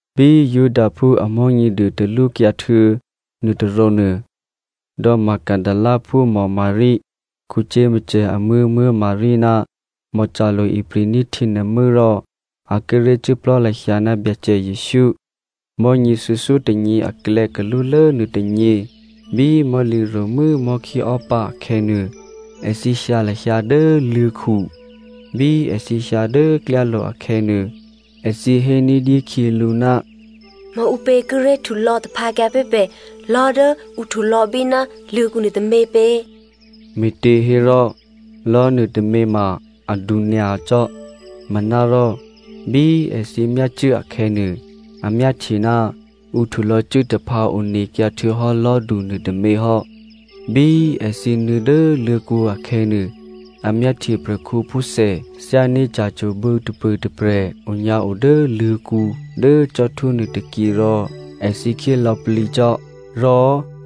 Bí Judaphú a Mò̤́nyěduô talwókyǎ htuô̌ nuôtôrǒnuô, Magdalena dò̌kǔphú Maria, Jakomo amuố̤ Maria ná Salome ipri̤ní̤ htyěnuô̤mû́ rò a kíré̤ cuốplò̤́ lahyǎ ná Byacè Jesǔ. Mò̤́nyě thuô̌thyótônyě aklè̌ kalúlố nuôtônyě bí mò̤́lǐro̤mû́ mò̤́khíò́pǎ akhè̌nuô, èthǐ hyǎ lahyǎ dố luô̤̌khu. Bí èthǐ hyǎ dố klyálo̤ akhè̌nuô, èthǐ hé ní̤dyé khyělǔ, “Maǔpě kíré̤ htulò̌ taphǎkyǎ pé̤ pè̤ lò̤́ dố ǔ htulò̌bí ná luô̤̌kǔ nuôtômě pě?” Me̤těhérò lò̤́nuô tômě ma adu nyacò́. Manárò bí èthǐ myácuố akhè̌nuô, a myáhtye ná ǔ htulò̌cuốtaphǎ onekyǎ htuô̌hò́ lò̤́du nuôtômě hò́. Bí èthǐ nuô̌ dố luô̤̌kǔ akhè̌nuô, a myáhtye prè̤khǔphúthè thyání̤ ca̤cwo̤bǔ tôpṳ̂ tôprè̤ onyǎo dố luô̤̌kǔ dố cò́htwó nuôtôkyě rò èthǐ khyé lò̌plǐcò́. Rò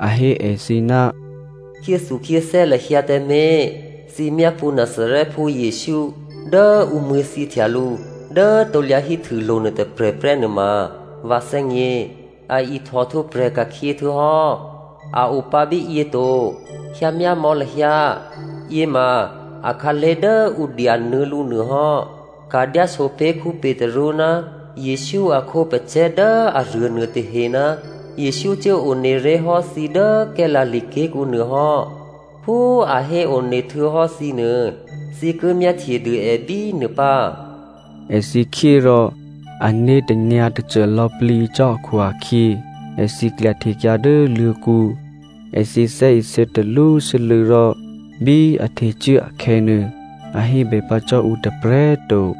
a hé èthǐ, “Khyéthukhyéthè́ lahyǎ tǎmé̤꤮, thǐ myápṳ̌ Nazarèphú Jesǔ dố ǔ mṳ̂̌thyěhtya lǔ dố krusulo̤ nuôtôprè̤ prè́ nuôma vǎ thè́gně. A ihtòhtwǒprè̤ ka̤khyě htuô̌hò́. A opǎ bíyě to. Hyǎmyámò̌ lahyǎ, yěma akhǎlé̤ dố ǔ dyanuô̌ lǔ nuôhò́. Ka̤dyáso pé̤ Petru ná Jesǔ a khǒpacè̤̌ dố aruô nuôtahe ná Jesǔ cuố one ré̤ hò́ thǐ dố Galilea ké̤kǔ nuô hò́. Phú a héone htuô̌hò́ thǐnuô thǐ ki myáhtye dû è bínuô pǎ.” Èthǐ khyé rò ané̤ tanyǎ̤tacố lò̌plǐ cò́ akhu-akhyě, èthǐ klyahtekyǎ dố luô̤̌kǔ. Èthǐ thè́isě talwósû́lû̌ rò bí a htecuố akhè̌nuô, a hébè pǎ cò́ ǔ tôprè̤꤮ to.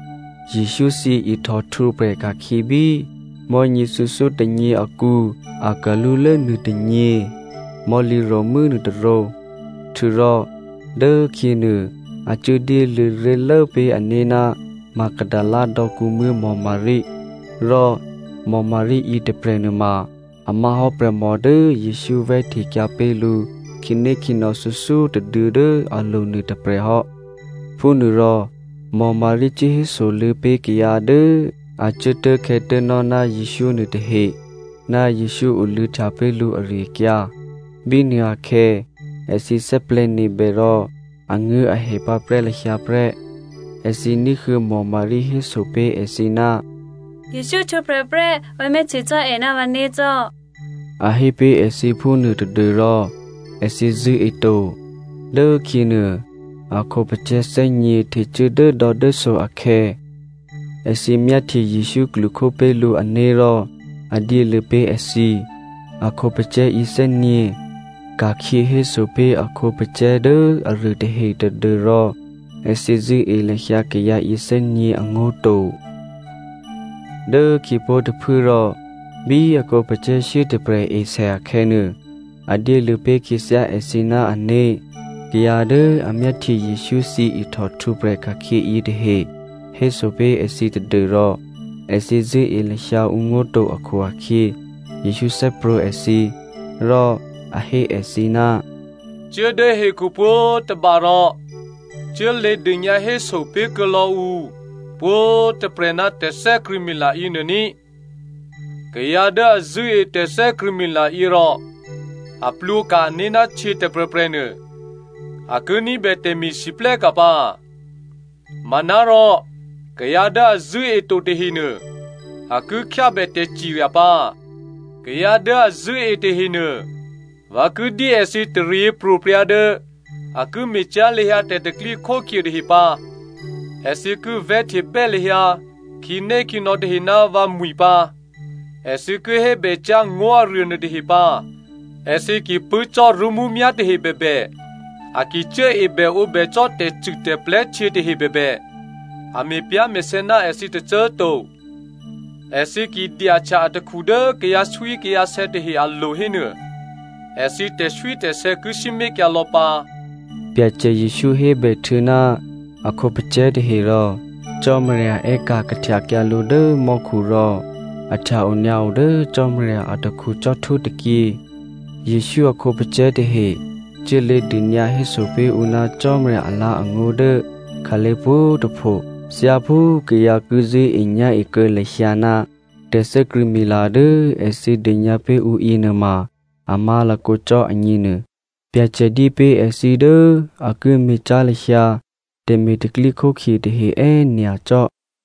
Jesǔ thyěihtò htwǒprè̤ ka̤khyě bí mò̤́nyě thuô̌thyótônyě akǔ akalúlố nuôtônyě mò̤́lǐro̤mû́ nuôtôrǒ. Htuô̌rò dốkhyěnuô a cuốdyéluô̌ ré̤lố pé̤ ané̤ ná Magdalena dò̌kǔmuố̤ Maria. Rò Maria yětôprè̤ nuôma a má̤ hò́ prè̤mò dố Jesǔ vè̤́htekyǎ pé̤ lǔ khǐnékhǐnò̌ thuô̌thyótôduô̌ dố alo̤ nuôtôprè̤ hò́. Phúnuôrò, Maria cuốhésoluô̌ pé̤ kayǎ dố a cuốtố̤khè̌tố̤nò́ ná Jesǔ nuôtahe ná Jesǔ oluô̌htya pé̤ lǔ ari-akyǎ. Bínuôakhè̌ èthǐ thè́plè̤̌nebè rò anguố̤ahè pǎprè́ lahyǎ prè́. Èthǐ ní̤huô̌ Maria héso pé̤ èthǐ, “Jesǔ htwǒprè̤ prè́, vǎ myáhtye cò́ è ná vǎné̤ cò́,” a hé pé̤ èthǐ phúnuô tadû́rò èthǐ zṳ̂́eto. Dốkhyěnuô a khǒpacè̤̌ thè́nyě̤ htecuố dốdò̌dốso akhè̌ èthǐ myáhtye Jesǔ klwokhó pé̤ lǔ ané̤ rò a dyéluô̌ pé̤ èthǐ. A khǒpacè̤̌ yěthè́nyě̤ ka̤khyě héso pé̤ a khǒpacè̤̌ dố aruôtahe tadû́rò èthǐ zṳ̂́e lahyǎ kayǎ yěthè́nyě̤ angó̤ to. Dố khyěpó̤ tôphuố rò bí a khǒpacè̤̌ shyétôprè̤ esè akhè̌nuô, a dyéluô̌ pé̤ khyěthyá èthǐ ná ané̤. Kayǎ dố a myáhtye Jesǔ thyěihtò htwǒprè̤ ka̤khyě yětahe héso pé̤ èthǐ tadû́rò èthǐ zṳ̂́e lahyǎ ǔngó̤ to akhu-akhyě, Jesǔ thè́prwǒ̤ èthǐ. Rò a hé èthǐ, “Cuố dố hekhu pwǒ̤tôba rò cuốlě dônyǎhéso pé̤kuô̌ lò̌ ǔ pwǒ̤꤮ tôprè̤ ná tè̤thè́krṳ̂̌mila yěnuô ní꤮. Kayǎ dố a zṳ̂́e tè̤thè́krṳ̂̌mila yě rò a plwǒka̤ ané̤ ná htyě tôprè̤prè̤ nuô a ki ní̤bè tè̤me̤lwóhteka̤ pǎ. Manárò kayǎ dố a zṳ̂́e to tahenuô a ki khyábè tè̤cirya pǎ꤮. Kayǎ dố a zṳ̂́e tahenuô vǎ ki dyé èthǐ taryěpro̤prya̤ dố a ki me̤cyá̤ lahyǎ tè̤pro̤tè̤prya̤ tahe pǎ. Èthǐ ki vè̤́htebè́ lahyǎ khǐnékhǐnò̌ tahe ná vǎmwi̤ pǎ, èthǐ ki hébè cyá̤ ngó̤aruô nuôtahe pǎ. Èthǐ ki pṳ̂́ cò́ rṳ́mǔmyá̤ tahe bèbè, a ki cuốebèǒbè cò́ tè̤cûtè̤plè̤́ htyě tahe bèbè, a me̤pyá̤me̤sè̌ ná èthǐ tôcô꤮ to. Èthǐ ki dyahtya atakhu dố kayǎswíkayǎsè̌ tahe alo̤ hénuô, èthǐ tè̤swítè̤sè̌ ki sǐmé̤kyǎ lò̌ pǎ.” Byacè Jesǔ hébèhtuô̌ ná a khǒpacè̤̌ tahe rò Cò́marya è́ka̤ kahtyakyǎ lǔ dố mò́khu rò a htya-onyǎo dố Cò́marya atakhu cò́htwó tôkyě. Jesǔ a khǒpacè̤̌ tahe cuốlě dônyǎhéso pé̤ ǔ ná Cò́marya alǎ̤angó̤ dố khǎlé̤ pwǒ̤꤮ tôpho. Thyáphú kayǎ ki zṳ̂́enyá̤e kuô̌ lahyǎ ná tè̤thè́krṳ̂̌mila dố èthǐ dônyǎ pé̤ ǔ yěnuôma a má̤lakǒ cò́ agněnuô, Byacè dyé pé̤ èthǐ dố a ki me̤cyá̤ lahyǎ tè̤me̤ tè̤pro̤tè̤prya̤ tahe è́nyacò́.